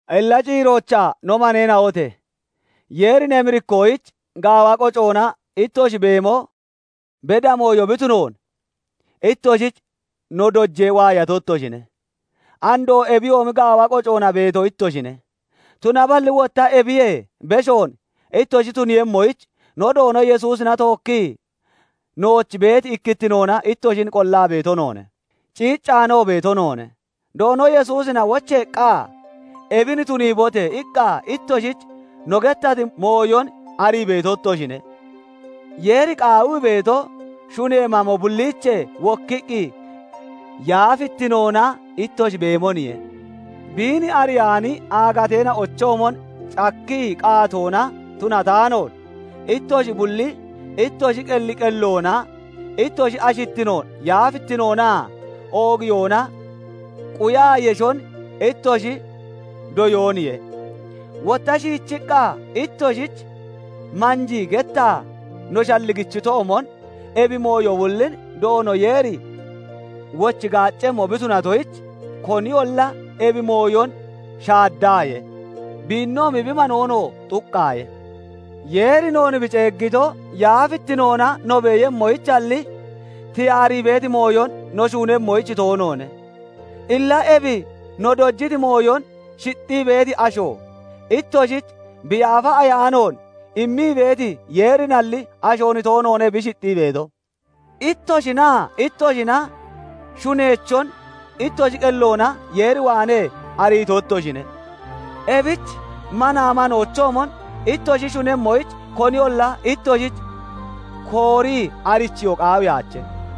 Illa ciiroochaa no maneena'ote! Yeerin emirikkoyich gaawa qocoona ittoshi beemo beda mooyo bi tunoon ittoshich no dojee waayato ittoshine; andoo ebiyoomi gaawa qocoona beeto ittoshine; tunaballi wotta ebiyee beshoon ittoshi tuniiyemmoyich no Doono Yesuusina tookkii nooch beeti ikkittinoona ittoshin qollaa beeto noone; ciiccaanoo beeto noone; Doono Yesuusina wocheeqqa, "Ebin tuniibote!" iqqa ittoshich no gettati mooyon arii beeto ittoshine. Yeeri qaawii beeto, shunee mamo bulliichee wokkiqqi yaafittinoona ittoshi beemoniye; Biin ariyaani aagateena'ochoomon cakkii qaatoona tunataanoon, ittoshi bulli ittoshi qelli qelloona ittoshi ashittinoon yaafittinoonaa oogiyoona quyaa yeshon ittoshi doyooniye; wotta shiichiqqa ittoshich manjii gettaa no shalligichitoomon, ebi mooyo bullin Doono Yeeri wochi gaaccemmo bi tunatoyich, koniyolla ebi mooyon shaaddaaye; biinoomi bi manoonoo xuqqaaye; Yeeri noon bi ceeggito, yaafittinoona no beeyemmoyichalli, tiyaarii beeti mooyon no shuunemmoyich toonoone. Illa ebi no dojiti mooyon shixxii beeti asho, ittoshich bi Yaafa Ayaanoon immii beeti Yeerinalli, ashoon toonoone bi shixxii beeto. Ittoshinaa ittoshina shuneechon ittoshi qelloona Yeer waanee ariito ittoshine; ebich manaa manoochoomon ittoshi shunemmoyich koniyolla ittoshich koorii arichiyoo qaawiyaache.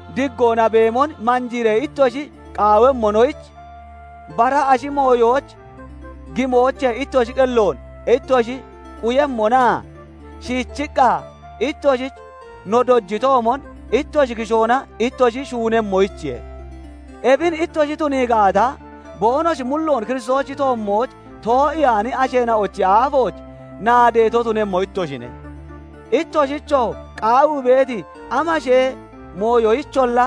diggoona beemon manjiiree ittoshi qaawemmonoyich, bara ashi mooyooch gimoochee ittoshi qelloon ittoshi quyemmonaa, shiichiqqa ittoshich no dojitoomon ittoshi kishoona ittoshi shuunemmonoyichiye; ebin ittoshi tunii gaata, boonoshi mulloon Kiristoosichi toommooch too'iyaani asheena'ochi aafooch naadeeto tunemmo ittoshine; ittoshichoo qaawii beeti amashee mooyoyicholla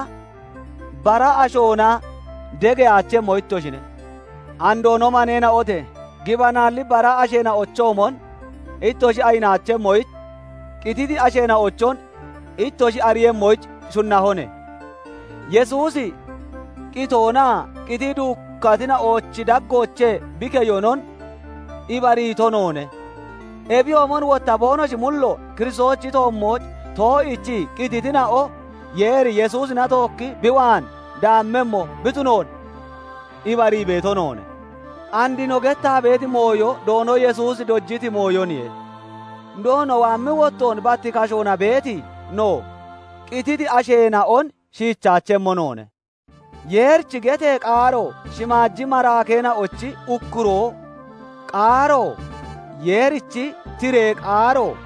bara ashoona degeyaachemmo ittoshine. Andoo no maneena'ote! Gibanaalli bara asheena'ochoomon ittoshi ayinaachemmoyich, qititi asheena'ochon ittoshi ariiyemmoyich shunnahone. Yesuusi qitoonaa qitii duukkatina'ochi daggoochee bi keyonon ibariito noone; ebiyoomon wotta boonoshi mulloon Kiristoosichi toommooch too'iichii qititina'on Yeeri Yesuusina tookki bi waan daammemmo bi tunoon ibarii beeto noone. And no gettaa beeti mooyo Doono Yesuusi dojiti mooyoniye; Doono waammi wottoon bat kashoona beeti no, qititi asheena'on shiichaachemmo noone. Yeerichi getee qaaro, shimaaji maraakeena'ochi ukkuroo qaaro, Yeerichi tiree qaaroo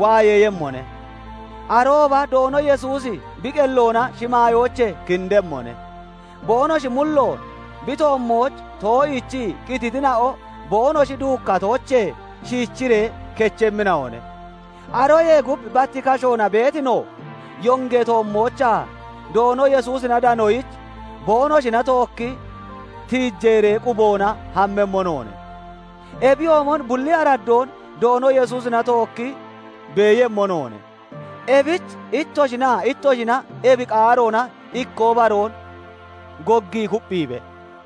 waayeeyemmone; arooba Doono Yesuusi bi qelloona shimaayoochee kindemmone; boonoshi mulloon bi toommooch too'iichii qititina'o boonoshi duukkatoochee shiichiree kechemmina'one. Aroyee gub bat kashoona beeti no, yongee toommoochaa Doono Yesuusina danoyich, boonoshina tookki tiijeeree quboona hammemmo noone; ebiyoomon bulli araddoon Doono Yesuusina tookki beeyemmo noone. Ebich ittoshinaa ittoshina ebi qaaroona ikkoo baroon goggii kupphiibe.